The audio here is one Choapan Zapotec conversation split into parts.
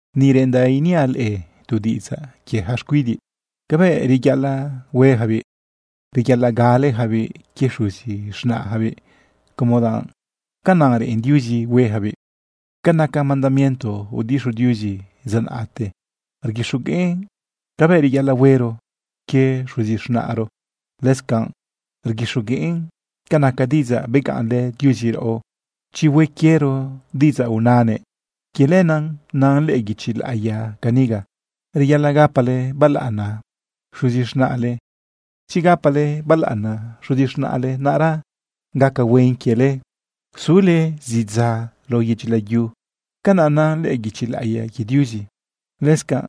Ni reꞌendaꞌ iniaꞌ leꞌe tu diꞌidzaꞌ quie yaca xcuidiꞌ cabëꞌ reyaꞌalaꞌ hueyacabiꞌ. Reyaꞌalaꞌ galeyacabiꞌ quie xuzi z̃naꞌyacabiꞌ como danꞌ canaꞌ reꞌen Diuzi hueyacabiꞌ. Ca naca mandamiento udixu Diuzi dza naꞌte rguixogueꞌn cabëꞌ reyaꞌalaꞌ huero quie xuzi z̃naꞌro, lëscanꞌ rguixogueꞌn ca naca diꞌidzaꞌ begaꞌnlë Diuzi raꞌo chi hue quiero diꞌidzaꞌ unanëꞌ. Quie lenaꞌ nan lëꞌë guichi laꞌiya caniga: “Reyaꞌalaꞌ gapale balaꞌana xuzi z̃naꞌle. Chi gapale balaꞌana xuzi z̃naꞌle, naꞌra gaca huen quiele sule zidza lao yedyi layu.” Canaꞌ nan lëꞌë guichi laꞌiya quie Diuzi. Lëscanꞌ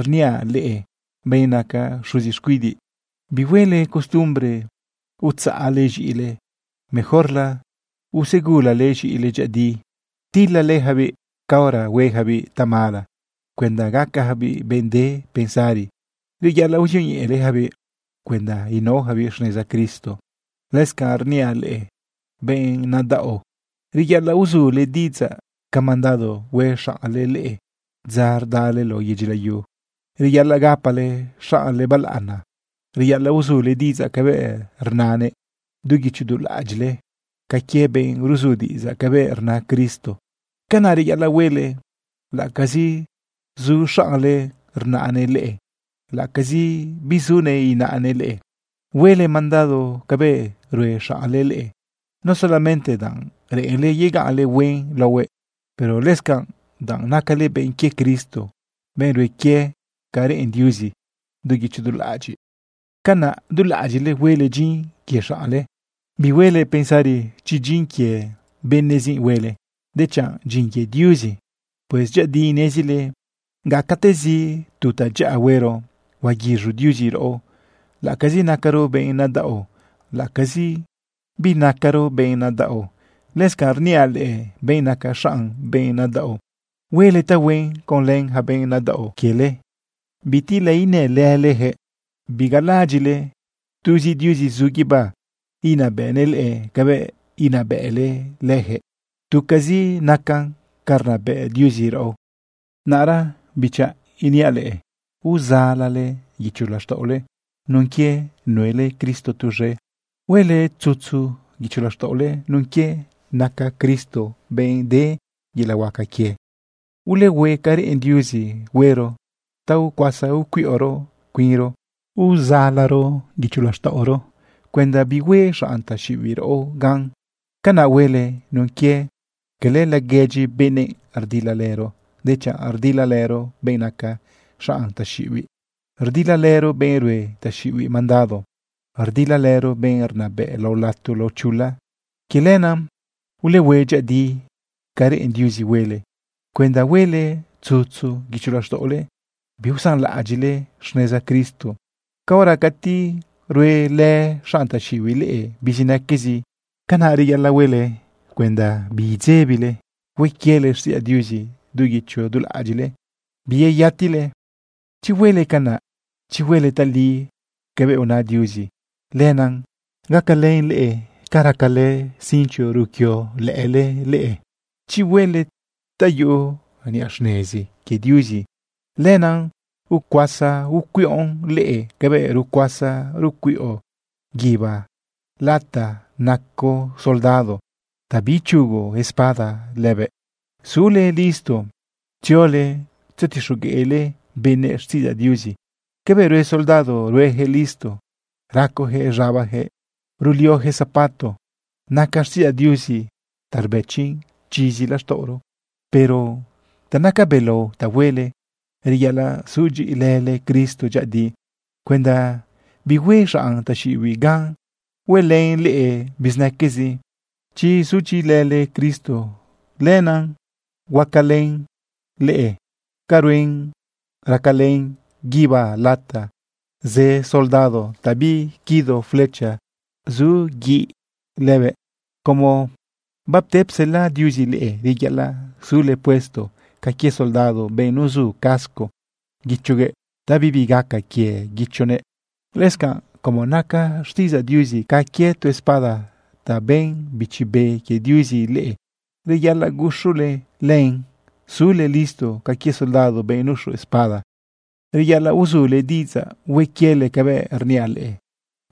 rniaꞌ leꞌe, benꞌ naca xuzi xcuidiꞌ, bihuele costumbre utzaꞌle z̃iꞌile. Mejorla usegulale z̃iꞌile dyëꞌëdi, tilaleyacabiꞌ caora hueyacabiꞌ tamala cuenda gacayacabiꞌ benꞌ de pensari. Reyaꞌalaꞌ uzioñeꞌeleyacabiꞌ cuenda inaoyacabiꞌ xneza Cristo. Lëscanꞌ rniaꞌ leꞌe, benꞌ nadaꞌo reyaꞌalaꞌ uzule diꞌidzaꞌ ca mandado hue xaꞌnle leꞌe dza rdale lao yedyi layu. Reyaꞌalaꞌ gapale xaꞌnle balaꞌana, reyaꞌalaꞌ uzule diꞌidzaꞌ cabëꞌ rnanëꞌ du guicho du laꞌadyiꞌle ca quie benꞌ ruzu diꞌidzaꞌ cabëꞌ rna Cristo. Canaꞌ reyaꞌalaꞌ huele laꞌacazi zu xaꞌnle rnaꞌnëꞌ leꞌe, laꞌacazi bizunëꞌ inaꞌnëꞌ leꞌe. Huele mandado cabëꞌ rue xaꞌnle leꞌe, no solamente danꞌ reꞌenle yegaꞌnle huen laohuëꞌ, pero lëscanꞌ danꞌ nacale benꞌ quie Cristo, benꞌ rue quie ca reꞌen Diuzi du guicho du laꞌadyiꞌ. Canaꞌ du laꞌadyiꞌle huele dyin quie xaꞌnle. Bihuele pensari chi dyin quie benëꞌzi huele, dechanꞌ dyin quie Diuzi. Pues dyëꞌëdi nezile gaꞌacatezi tu tadyaꞌa huero, huaguiz̃u Diuzi raꞌo, laꞌacazi nacaro benꞌ nadaꞌo, laꞌacazi benacaro benꞌ nadaꞌo. Lëscanꞌ rniaꞌ leꞌe, benꞌ naca xanꞌ benꞌ nadaꞌo, huele tahuen conlë yaca benꞌ nadaꞌo quiele. Bitila inëlële leyaquëꞌ. Bigalaꞌadyiꞌle tuzi Diuzi zu guibá inabëꞌnëꞌ leꞌe cabëꞌ inabëꞌle leyaquëꞌ. Tucazi nacan ca rnabëꞌ Diuzi raꞌo. Naꞌra, bichaꞌ, iniaꞌ leꞌe uzalale guicho laxtaꞌole nun quie nuele Cristo tuz̃e. Huele tzutzu guicho laxtaꞌole nun quie naca Cristo benꞌ de yelaꞌ huaca quie. Ulehue ca reꞌen Diuzi huero ta ucuasa ucuiꞌoro cuinro uzalaro guicho laxtaꞌoro cuenda bihue xanꞌ taxiꞌibiꞌ raꞌo gan. Canaꞌ huele nun quie cala laguedyi benëꞌ rdilalëro, dechanꞌ rdilalëro benꞌ naca xanꞌ taxiꞌibiꞌ, rdilalëro benꞌ rue taxiꞌibiꞌ mandado, rdilalëro benꞌ rnabëꞌ lao lato lao chula. Quie lenaꞌ ulehue dyëꞌëdi ca reꞌen Diuzi huele cuenda huele tzutzu guicho laxtaꞌole biusanlaꞌadyiꞌle xneza Cristo caora cati ruelë xanꞌ taxiꞌibiꞌ leꞌe bizinaquezi. Canaꞌ reyaꞌalaꞌ huele cuenda bidzebile hue quiele xtiꞌidzaꞌ Diuzi du guicho du laꞌadyiꞌle biyeyatile. Chi huele canaꞌ, chi huele tali cabëꞌ una Diuzi, lenaꞌ gacalën leꞌe ca racalë cincho ruquio lëꞌële leꞌe. Chi huele ta yuꞌu niꞌa xnezi quie Diuzi, lenaꞌ ucuasa ucuiꞌon leꞌe cabëꞌ rucuasa rucuiꞌo guíba lata naco soldado ta biichugo espada lëbëꞌ. Sule listo tziole tzetixogueꞌle benëꞌ xtiꞌidzaꞌ Diuzi cabëꞌ rue soldado ruejëꞌ listo racojëꞌ z̃abayaquëꞌ ruliojëꞌ zapato. Naca xtiꞌidzaꞌ Diuzi ta rbëchin chizi laxtaꞌoro. Pero ta naca belao ta huele, reyaꞌalaꞌ sudyiꞌilële Cristo dyëꞌëdi cuenda bihue xanꞌ taxiꞌibiꞌ gan huelën leꞌe bizinaquezi. Chi sudyiꞌilële Cristo, lenaꞌ huen defender leꞌe ca rue defender guíba lata zë soldado ta biquido flecha zu guiꞌ lëbëꞌ. Como bapte psela Diuzi leꞌe, reyaꞌalaꞌ sule puesto ca quie soldado, benꞌ nuzu casco guichogue ta bibi gaca quie guichonëꞌ. Lëscanꞌ como naca xtiꞌidzaꞌ Diuzi ca quie tu espada ta ben Bichi Be quie Diuzi leꞌe, reyaꞌalaꞌ guxule len sule listo ca quie soldado, benꞌ nuxu espada. Reyaꞌalaꞌ uzule diꞌidzaꞌ hue quiele cabëꞌ rniaꞌ leꞌe.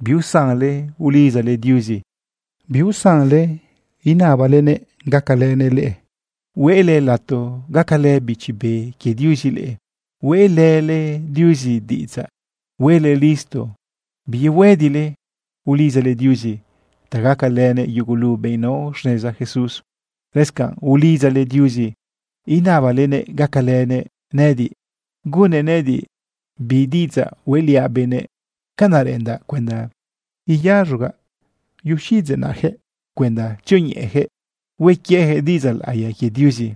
Biusanle ulidzale Diuzi. Biusanle inabalenëꞌ gacalënëꞌ leꞌe. Hueꞌle lato gacalë Bichi Be quie Diuzi leꞌe hueꞌlële Diuzi diꞌidzaꞌ. Huele listo, biyehuëdile. Ulidzale Diuzi ta gacalënëꞌ yugulu benꞌ nao xneza Jesús. Lëscanꞌ ulidzale Diuzi inabalenëꞌ gacalënëꞌ nëꞌëdiꞌ gunnëꞌ nëꞌëdiꞌ bi diꞌidzaꞌ hueꞌliaꞌ benëꞌ. Canaꞌ reꞌennan cuenda iyaz̃ugaꞌ yuxiꞌidzeꞌnaꞌyaquëꞌ cuenda tzioñeꞌeyaquëꞌ hue quieyaquëꞌ diꞌidzaꞌ laꞌiya quie Diuzi.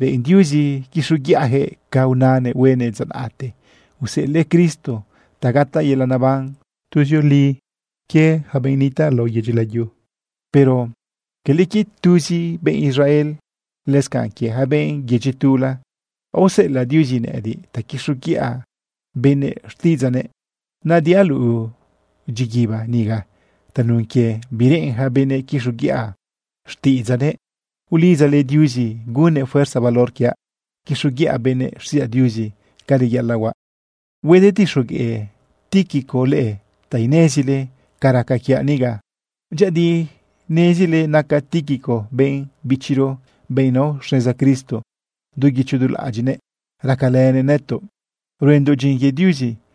Reꞌen Diuzi quixoguiꞌayaquëꞌ ca unanëꞌ huenëꞌ dza naꞌte useꞌelëꞌ Cristo ta gataꞌ yelaꞌ neban tuzioli para yaca benꞌ nitaꞌ lao yedyi layu, pero cala quie tuzi benꞌ Israel, lëscanꞌ quie yaca benꞌ yedyi tula. Aoseꞌelaꞌ Diuzi nëꞌëdiꞌ ta quixoguiꞌa benëꞌ xtiꞌidzaꞌnëꞌ, naꞌ diaꞌ luꞌu dyiguiba niga tanun quie bireꞌen yaca benëꞌ quixoguiꞌa xtiꞌidzaꞌnëꞌ. Ulidzale Diuzi gunnëꞌ fuerza valor quiaꞌ quixoguiꞌa benëꞌ xtiꞌidzaꞌ Diuzi ca reyaꞌalaꞌ huaꞌ. Huedetixogueꞌ Tíquico leꞌe ta inezile ca raca quiaꞌ niga. Dyëꞌëdi nezile naca Tíquico benꞌ bichiro, benꞌ nao xneza Cristo. Du guicho du laꞌadyiꞌnëꞌ racalënëꞌ nëtoꞌ ruendoꞌ dyin quie Diuzi.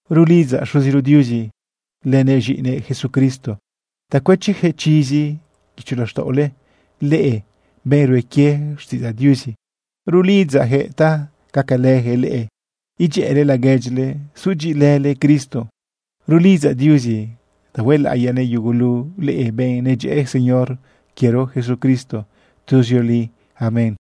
Rulidzaꞌ Xuziro Diuzi lënëꞌ z̃iꞌinëꞌ Jesucristo ta cuëchiyaquëꞌ chizi guicho laxtaꞌole leꞌe, benꞌ rue quie xtiꞌidzaꞌ Diuzi. Rulidzaꞌyaquëꞌ ta gacalëyaquëꞌ leꞌe idyëꞌële laguedyile sudyiꞌilële Cristo. Rulidzaꞌ Diuzi ta huelaꞌiyanëꞌ yugulu leꞌe benꞌ nedyëꞌe Señor quiero Jesucristo tuzioli. Amén.